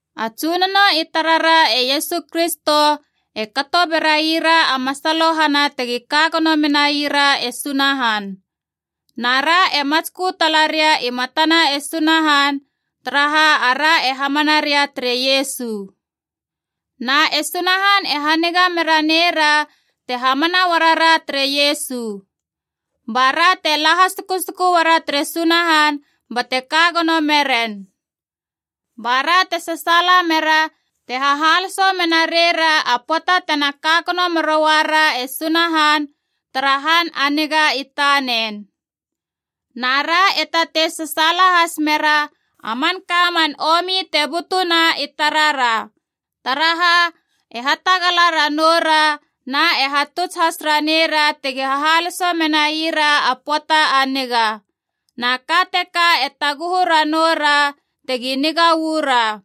A Tsunono i tarara e Iesu Kristo e kato beraira a masalohana tegi ka gono menai ra e Sunahan. Na ra e matskö tala ria i matana e Sunahan, taraha ara e hamana ria tere Iesu. Na e Sunahan e haniga mera neira te hamana uarara tere Iesu. Ba ra te la hasukusuku uara tere Sunahan bate ka gono meren. Ba ra te sasaala mera te hahaloso mena reira a pöata tena ka gono meroara e Sunahan tara han a niga i tanen. Na ra e tatei sasaala has mera a manka man omi te butuna i tarara. Taraha, e hatagala ranoura na e hatuts has ranei ra tegi hahaloso menaira a pöata a niga. Na ka teka e taguhu ranou ra tegi niga uu ra.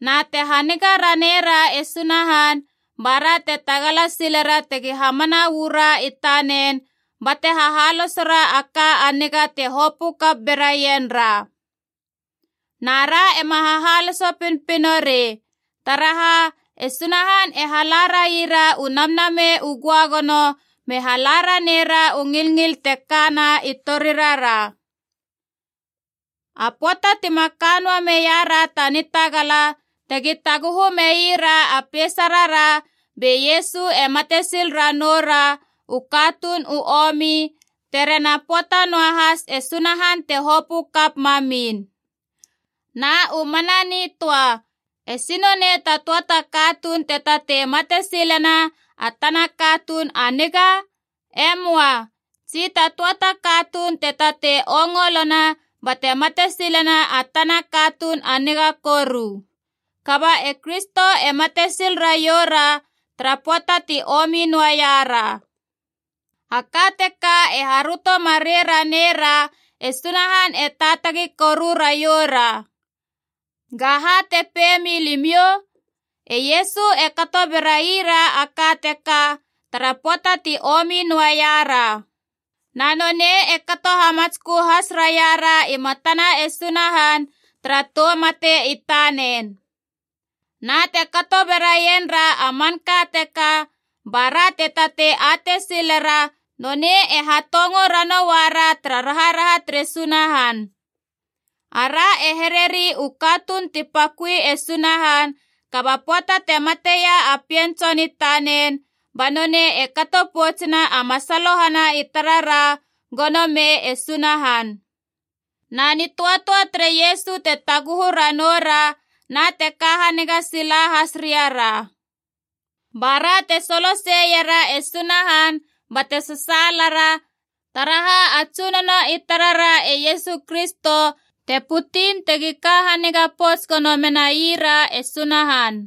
Na te haniga renara e Sunahan, ba ra te tagala silera tegi hamana uu ra i tanen bate hahalosera a ka a niga te hopö kap beraien ra. Na ra ema hahaloso pinopino rei, taraha e Sunahan e hala raira u Namnamei u Göagono me hala raneira u ngilngil te kana i torirara. A pöata tima ka noa meira ta nitagala tegi taguhu meira a peisarara, be Iesu e mate sil ranoura u katuun u omi, terena pöata noahas e Sunahan te hopö kap mamin. Na u mana nitöa, esi nonei ta töa ta katuun te tatei mate silena a tana katuun a niga? E möa. Tsi ta töa ta katuun te tatei ongolona bate mate silena a tana katuun a niga koru. Kaba e Kristo e mate sil raioura tara pöata ti omi noaiara. A ka teka e haröto marei ranei ra e Sunahan e taatagi koru raioura. Ga ha te pei milimiou? E Iesu e kato berai ra a ka teka tara pöata ti omi noaia ra. Na nonei e kato hamatskö has raiara i matana e Sunahan tara tou mate i tanen. Na te kato beraien ra a manka teka, ba ra te tatei atei silera nonei e hatongo ranoua ra tara raharaha tere Sunahan. Ara e hereri u katuun ti paköi e Sunahan, kaba pöata te mateia a Pien Tson i tanen, ba nonei e kato poutsena a masalohana i tarara gono mei e Sunahan. Na nitöatöa tere Iesu te taguhu ranoura, na te ka haniga sila has riara. Ba ra te soloseiera e Sunahan bate sasaalara, taraha a Tsunono i tarara e Iesu Kristo te putin tegi ka haniga pouts gono menaira e Sunahan.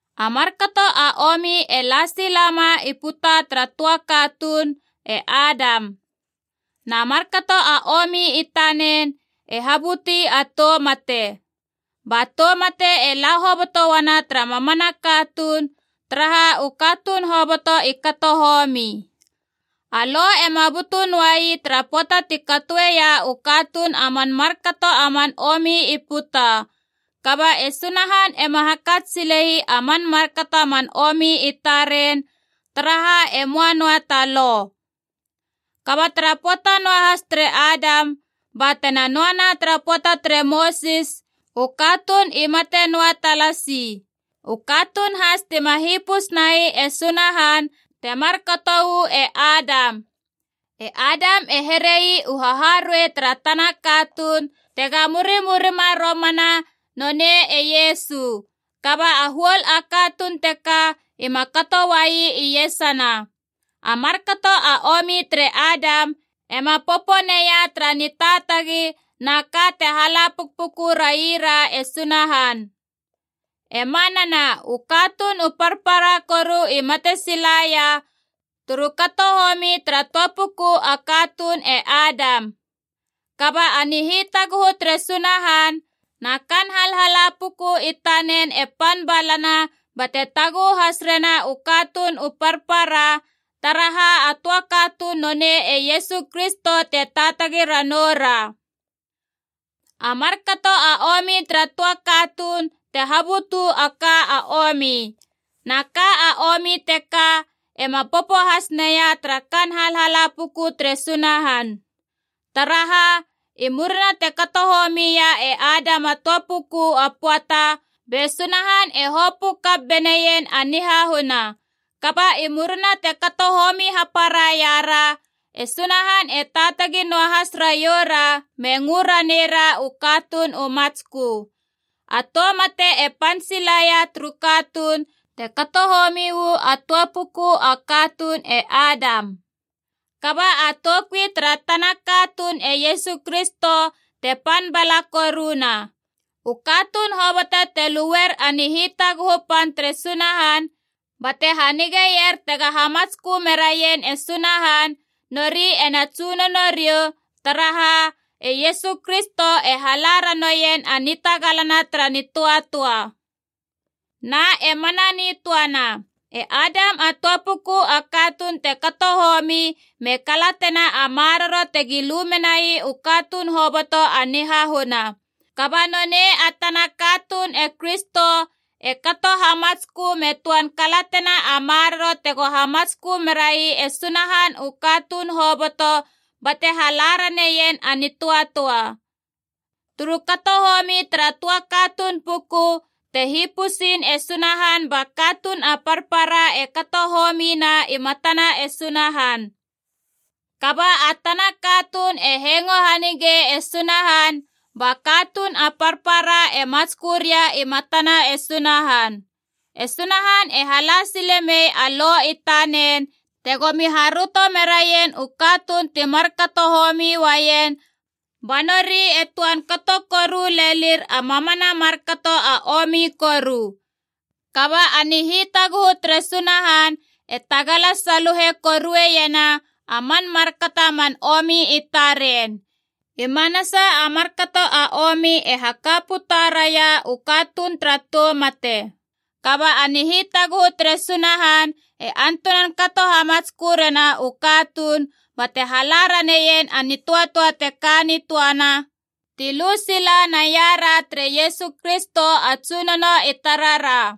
A markato a omi e la sila ma i puta tara töa katuun, e Adam. Na markato a omi i tanen e habuti a tou mate. Ba tou mate e la hoboto uana tara mamana katuun, taraha u katuun hoboto i kato homi. A Lo ema butu noai tara pöata ti katoeia u katuun a man markato a man omi i puta. Kaba e Sunahan ema hakats sile ii a man markato a man omi i taren, taraha e möa noa ta Lo. Kaba tara pöata noahas tere Adam ba tena noana tara pöata tere Mosis u katuun i mate noa talasi. U katuun has tima hipus nai e Sunahan, temar kato uu e Adam. E Adam e here ii u haharuei tara tana katuun tega murimurima romana, nonei e Iesu. Kaba a huol a katuun teka ima kato uai iesana. A markato a omi tere Adam ema poponeia tara nitaatagi na ka te hala pukpuku raira e Sunahan. E manana, u katuun u parpara koru i mate silaia turu kato homi tara töa puku a katuun e Adam. Kaba a nihitaguhu tere Sunahan na kaan halhala puku i tanen e pan balana, bate taguhu has rena u katuun u parpara, taraha a töa katuun nonei e Iesu Kristo te taatagi ranou ra. A markato a omi tara töa katuun te habutu a ka a omi. Na ka a omi teka ema popo has neia tara kaan halhala puku tere Sunahan. Taraha, i murina te kato homi ia e Adam a töa puku a pöata, be Sunahan e hopö kap beneien a nihahuna. Kaba i murina ti kato homi hapara iara, e Sunahan e taatagi noa has raioura me ngö ranei ra u katuun u matskö. A tou mate e pan sila ia turu katuun, te kato homi uu a töa puku a katuun e Adam. Kaba a toukui tara tana katuun e Iesu Kristo te pan bala koruna. U katuun hoboto te luer a nihitaguhu pan tere Sunahan bate hanigeier tega hamatskö meraien e Sunahan, nori ena tsunono riou, taraha, e Iesu Kristo e hala ranoien a nitagalana tara nitöatöa. Na e mana nitöana. E Adam a töa puku a katuun te kato homi me kalatena a maroro tegi lu menai u katuun hoboto a nihahuna. Kaba nonei a tana katuun e Kristo e kato hamatskö me töan kalatena a maroro tego hamatskö merai e Sunahan u katuun hoboto bate hala raneien a nitöatöa. Turu kato homi tara töa katuun puku te hipusin e Sunahan ba katuun a parpara e kato homina i matana e Sunahan. Kaba a tana katuun e hengo hanigei e Sunahan, ba katuun a parpara e matskö ria i matana e Sunahan. E Sunahan e hala sile mei a Lo i tanen tegomi haröto meraien u katuun ti markato homi uaien, ba nori e töan kato koru lelir a mamana a markato a omi koru. Kaba a nihitaguhu tere Sunahan e tagala saluhe korueiena a man markato a man omi i taren. I manasa a markato a omi e haka puta raia u katuun tara tou mate. Kaba a nihitaguhu tere Sunahan e antunan kato hamatskö rena u katuun bate hala raneien a nitöatöa te ka nitöana ti lu sila naiara tere Iesu Kristo a Tsunono i tarara.